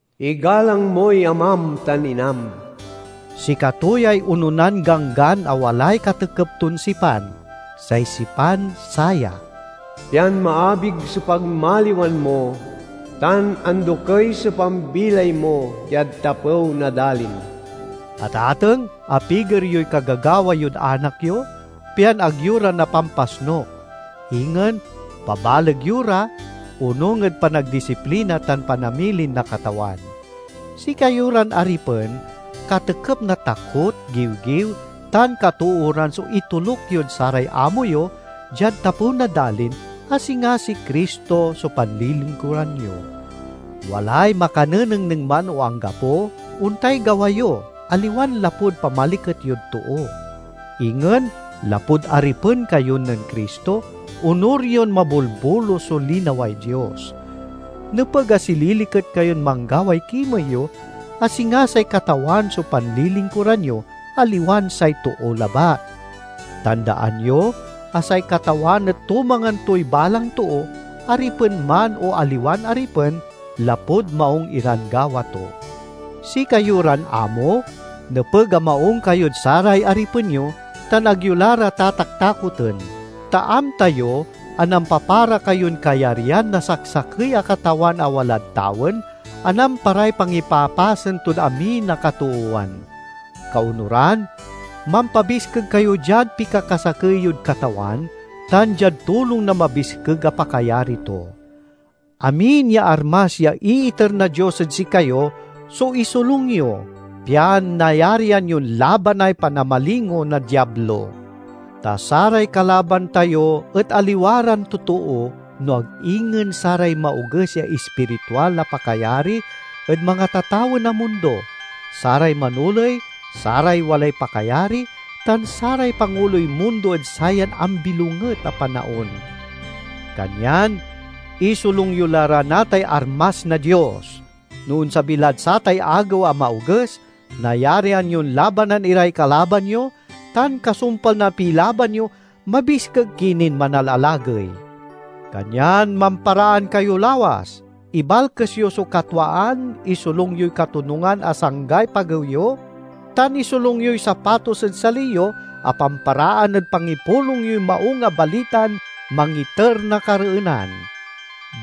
"Igalang moy amam tan inam." Sikato yay ononan ganggan a walay katekep ton sipan; say sipan saya: "pian maabig so pagmaliwan mo tan andokey so pambilay mo diad tapew na dalin." Atateng, apiger yoy kagagawa yod anak yo pian ag yo ra napampasnuk. Ingen, pabaleg yo ra onung ed panagdisiplina tan panamilin na Katawan. Sikayo ran aripen katekep na takot, giwgiw, tan katooran so itoluk yod saray amo yo diad tapew na dalin, a singa si Cristo so panlilingkuran yo. Walay makanenengneng man o anggapo, ontay gawa yo, aliwan lapud pamaliket yod too; ingen lapud aripen kayo nen Cristo, onur yon mabolbolus so linaway Dios. Nepeg a sililiket kayon manggaway kimey yo, a singa say Katawan so panlilingkuran yo, aliwan say too labat. Tandaan yo a say Katawan et tumangan toy balang too, aripen man o aliwan aripen, lapud maung iran gawa to. Sikayo ran amo, nepeg a maung kayod saray aripen yo, tan ag yo la ra tataktakoten. Ta amta yo a nampapara kayon kayaryan na saksakey a Katawan a walad tawen a namparay pangipapasen tod amin a katoowan. Kaonuran, mampabiskeg kayo diad pikakasakey yod Katawan tan diad tulong na mabiskeg a pakayari to. Amin ya armas ya iiter na Dios ed sikayo so isolung yo, pian nayarian yon labanay panamalingo na Diablo. Ta saray kalaban tayo et aliwa ran totoo, no ag ingen saray maoges ya ispiritual a pakayari ed mangatatawen a mundo, saray manoley, saray walay pakayari, tan saray panguloy mundo ed sayan ambilonget a panaon. Kanyan isolung yo la ra natay armas na Dios! No onsabi lad satay agew a maoges, nayarian yon labanan iray kalaban yo, tan kasumpal na pilaban yo, mabiskeg ki nin manalalagey. Kanyan mamparaan kayo lawas; ibalkes yo so katwaan, isolung yoy katonungan a sanggay pagew yo, tan isolung yoy sapatos ed sali yo a pamparaan ed pangipulong yoy Maung a Balitan mangiter na kareenan.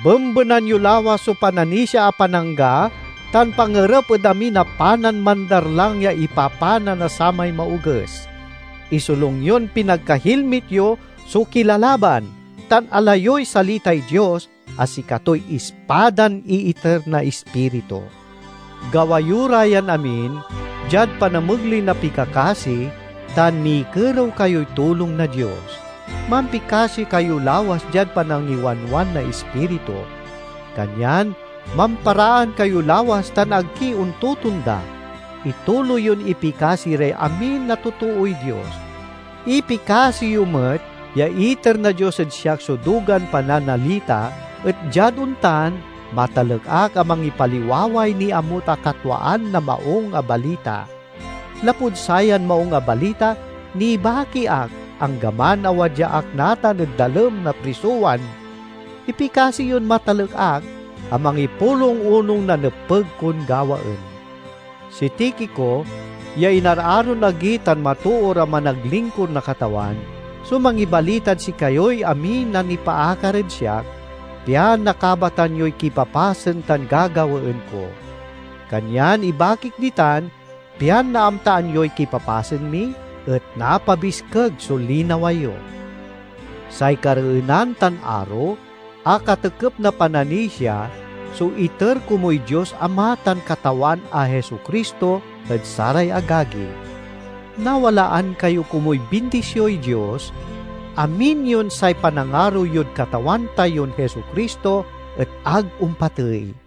Bembenan yo lawas so pananisia a panangga tan pangerep ed amin a panan mandarlang ya ipapana na samay Maoges. Isolung yon pinagkahilmit yo so kilalaban, tan ala yoy salitay Dios a sikatoy ispadan iiter na Ispiritu. Gawa yo ra yan amin diad panamegley na pikakasi tan mikerew kayoy tulong na Dios. Mampikasi kayo lawas diad panangiwanwan na Ispiritu. Kanyan mamparaan kayo lawas tan ag ki ontotonda; ituloy yon ipikasi ray amin a totooy Dios. Ipikasi yo met ya iter na Dios ed siak so dugan pananalita, et diad ontan, matalek ak a mangipaliwaway niamut a katwaan na Maung a Balita. Lapud sayan Maung a Balita, nibaki ak, anggaman a wadya ak natan ed dalem na prisowan. Ipikasi yon matalek ak a mangipulong onung na nepeg kon gawaen. Si Tikico, ya inararon agi tan matoor a managlingkur na Katawan, so mangibalitad sikayoy amin a nipaakar ed siak, pian nakabatan yoy kipapasen tan gagawaen ko. Kanyan ibakik ditan pian naamtaan yoy kipapasen mi, et napabiskeg so linawa yo. Say kareenan tan aro a katekep na pananisia so iter komuy Dios Ama tan Katawan a Jesu-Cristo ed saray agagi. Nawalaan kayo komuy bindisioy Dios, amin yon say panangaro yod Katawan tayon Jesu-Cristo et ag ompatey.